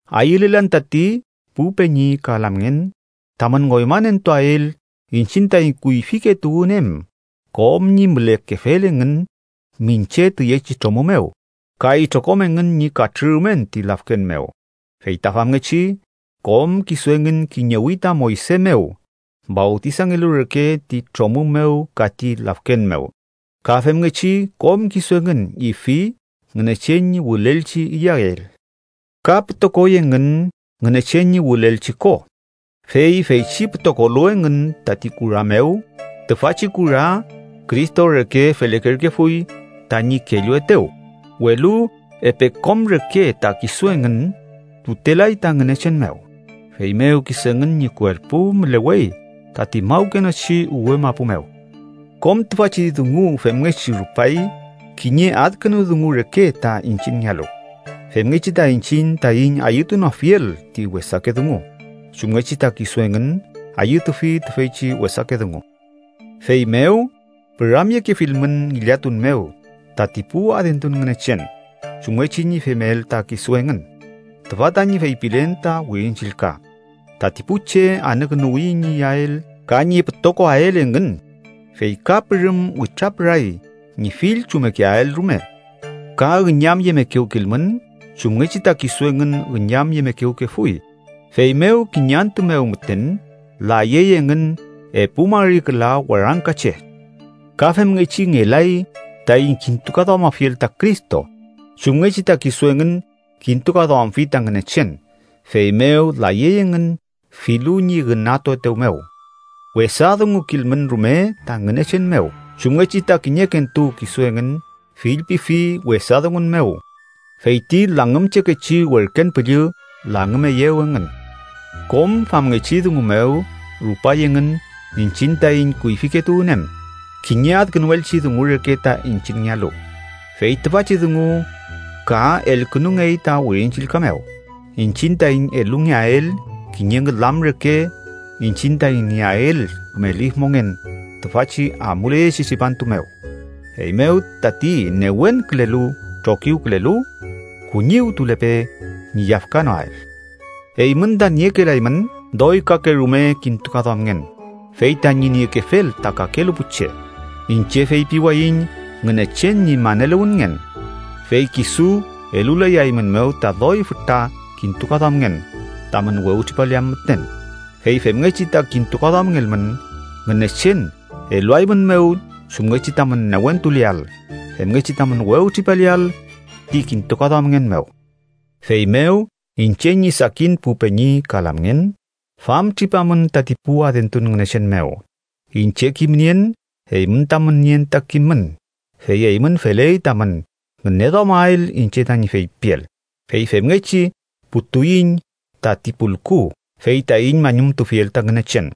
Ayülelan tati pu peñi ka lamngen tamün ngoymanentuael iñchiñ taiñ kuyfike tuwün em kom ñi mülekefel engün miñche tüyechi tromü mew, ka itrokom engün ñi katrürumen ti lafken mew. Feyta famngechi kom kisu engün kiñewi ta Moyse mew fawtisangelu reke ti tromü mew ka ti lafken mew. Ka femngechi, kom kisu engün ifi Ngünechen ñi wülelchi iyael ka pütokoy engün Ngünechen ñi wülelchi ko, fey feychi pütokolu engün tati kura mew, tüfachi kura Cristo reke felekerkefuy, tañi kelluetew. Welu epe kom reke ta kisu engün tutelay ta Ngünechen mew, feymew kisu engün ñi kuerpu mülewey tati mawkenochi uwe mapu mew. Kom tüfachi dungu femngechi rupay kiñe adkünu dungu reke ta iñchiñngealu, femngechi ta iñchiñ taiñ ayütunoafiel ti wesake dungu, chumngechi ta kisu engün ayütufi tüfeychi wesake dungu. Feymew püramyekefilmün ngillatun mew tati pu adentun ngünechen, chumngechi ñi femel ta kisu engün. Tüfa tañi feypilen ta Wirin Chillka: “Tati pu che anükünuwi ñi iyael ka ñi pütokoael engün, fey ka pürüm witrapüray ñi fill chummekeael rume.” Ka üñamyemekewkilmün, chumngechi ta kisu engün üñamyemekewkefuy, feymew kiñe antü mew müten layey engün epu mari küla warangka che. Ka femngechi ngelay taiñ kintukaduamafiel ta Cristo, chumngechi ta kisu engün kintukaduamfi ta Ngünechen, feymew layey engün filu ñi ünatuetew mew. Wesa dungukilmün rume ta Ngünechen mew chumngechi ta kiñekentu kisu engün fillpifi wesa dungun mew, fey ti langümchekechi werken püllü langümeyew engün. Kom famngechi dungu mew rupay engün iñchiñ taiñ kuyfike tuwün em, kiñe adkünuelchi dungu reke ta iñchiñngealu, fey tüfachi dungu ka elkünungey ta Wirin Chillka mew iñchiñ taiñ elungeael kiñe ngülam reke iñchiñ taiñ nieael küme lif mongen tüfachi amuleyechi tripantu mew. Feymew tati newenkülelu trokiwkülelu, kuñiwtulepe ñi yafkanoael. Eymün ta niekelaymün doy kakerume kintukaduamngen fey tañi niekefel ta kakelu pu che. Iñche feypiwayiñ Ngünechen ñi maneluwünngen. Fey kisu elulayaeymünmew ta doy fütra kintukaduamngen tamün wewtripaleam müten. Fey femngechi ta kintukaduamngelmün, Ngünechen eluaeymünmew chumngechi tamün newentuleael, femngechi tamün wewtripaleael ti kintukaduamngen mew. Feymew iñche ñi sakin pu peñi ka lamngen, famtripamün tati pu adentun ngünechen mew. Iñche kimnien eymün tamün nien ta kimün, fey eymün feley tamün ngüneduamael iñche tañi feypiel. Fey femngechi putuiñ tati pulku fey taiñ mañumtufiel ta Ngünechen,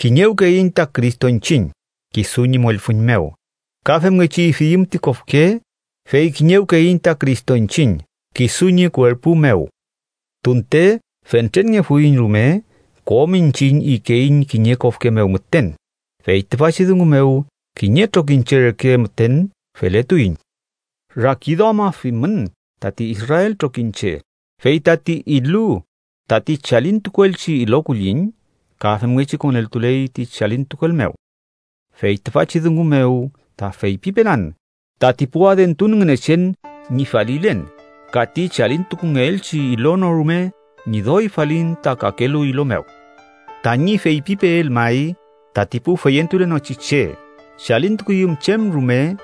kiñewkeiñ ta Cristo iñchiñ kisu ñi mollfüñ mew. Ka femngechi ifiyüm ti kofke, fey kiñewkeiñ ta Cristo iñchiñ kisu ñi kuerpu mew. Tunte fentrenngefuiñ rume, kom iñchiñ ikeiñ kiñe kofke mew müten, fey tüfachi dungu mew kiñe trokiñche reke müten feletuiñ. Rakiduamafimün tati Israel trokiñche: fey tati ilu tati chalintukuelchi ilo kulliñ, ka femngechi koneltuley ti chalintukuel mew. Fey tüfachi dungu mew ta feypipelan tati pu adentun ngünechen ñi falilen, ka ti chalintukungeelchi ilo no rume ñi doy falin ta kakelu ilo mew. Tañi feypipeel may tati pu feyentulenochi che chalintukuyüm chem rume,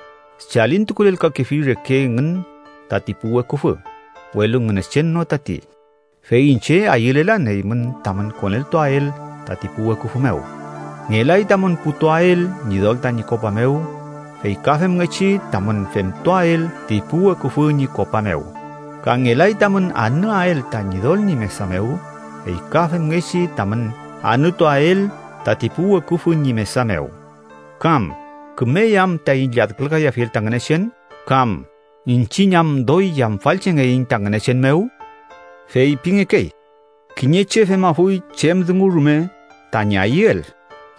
chalintukulelkakefi reke engün tati pu weküfü, welu Ngünechen no tati. Fey iñche ayülelan eymün tamün koneltuael tati pu weküfü mew. Ngelay tamün putuael Ñidol tañi kopa mew, fey ka femngechi tamün femtuael ti pu weküfü ñi kopa mew. Ka ngelay tamün anüael ta Ñidol ñi mesa mew, fey ka femngechi tamün anütuael tati pu weküfü ñi mesa mew. ¿Kam kümey am taiñ lladkülkayafiel ta Ngünechen? ¿Kam iñchiñ am doy yamfalchengeiñ ta Ngünechen mew? Feypingekey: “Kiñe che femafuy chem dungu rume tañi ayüel.”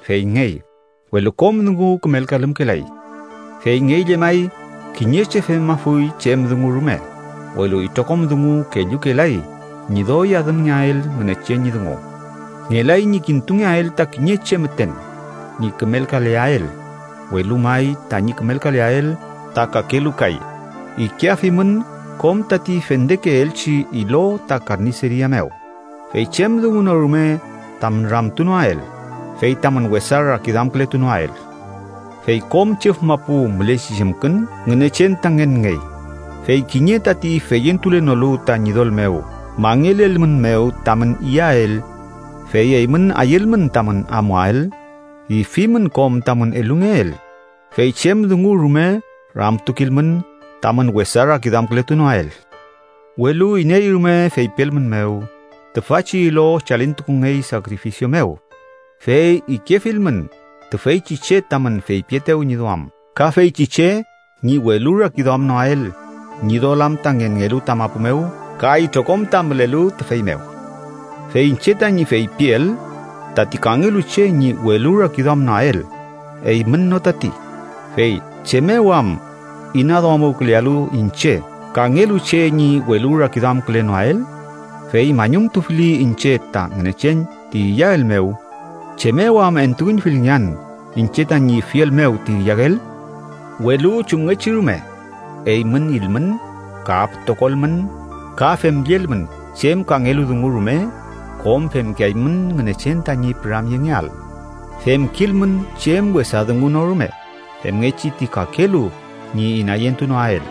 Feyngey, welu kom dungu kümelkalümkelay. Feyngey llemay, kiñe che femafuy chem dungu rume, welu itrokom dungu kellukelay ñi doy adümngeael Ngünechen ñi dungu. Ngelay ñi kintungeael ta kiñe che müten ñi kümelkaleael, welu may tañi kümelkaleael ta kakelu kay. Ikeafimün kom tati fendekeelchi ilo ta karniceria mew, fey chem dungu no rume tamün ramtunoael, fey tamün wesa rakiduamkületunoael. Fey “kom chüf mapu mülechi chemkün Ngünechen ta ngenngey.” Fey kiñe tati feyentulenolu ta Ñidol mew mangelelmünmew tamün iyael, fey eymün ayülmün tamün amuael, ifimün kom tamün elungeel, fey chem dungu rume ramtukilmün tamün wesa rakiduamkületunoael. Welu iney rume feypielmünmew: “Tüfachi ilo chalintukungey sakrifisio mew”, fey ikefilmün tüfeychi che tamün feypietew ñi duam ka feychi che ñi welurakiduamnoael. Ñidol am ta ngenngelu ta mapu mew ka itrokom ta mülelu tüfey mew. Fey iñche tañi feypiel tati kangelu che ñi welurakiduamnoael, eymün no tati. Fey ¿chem mew am inaduamuwkülealu iñche kangelu che ñi welurakiduamkülenoael? Fey mañumtufili iñche ta Ngünechen ti iyael mew, ¿chem mew am entuüñfilngean iñche tañi ifiel mew ti iyael? Welu chumngechi rume, eymün ilmün, ka pütokolmün, ka femllelmün chem kangelu dungu rume, kom femkeaymün Ngünechen tañi püramyengeael. Femkilmün chem wesa dungu no rume femngechi ti kakelu ñi inayentunoael,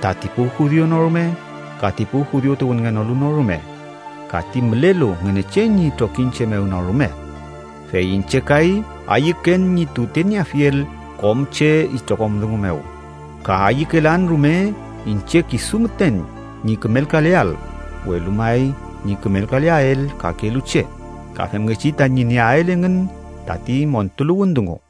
tati pu judiu no rume ka ti pu judiu tuwünngenolu no rume, ka ti mülelu Ngünechen ñi trokiñche mew no rume. Fey iñche kay, ayüken ñi tutenieafiel kom che itrokom dungu mew, ka ayükelan rume iñche kisu müten ñi kümelkaleael, welu may ñi kümelkaleael kakelu che, ka femngechi tañi nieael engün tati montuluwün dungu.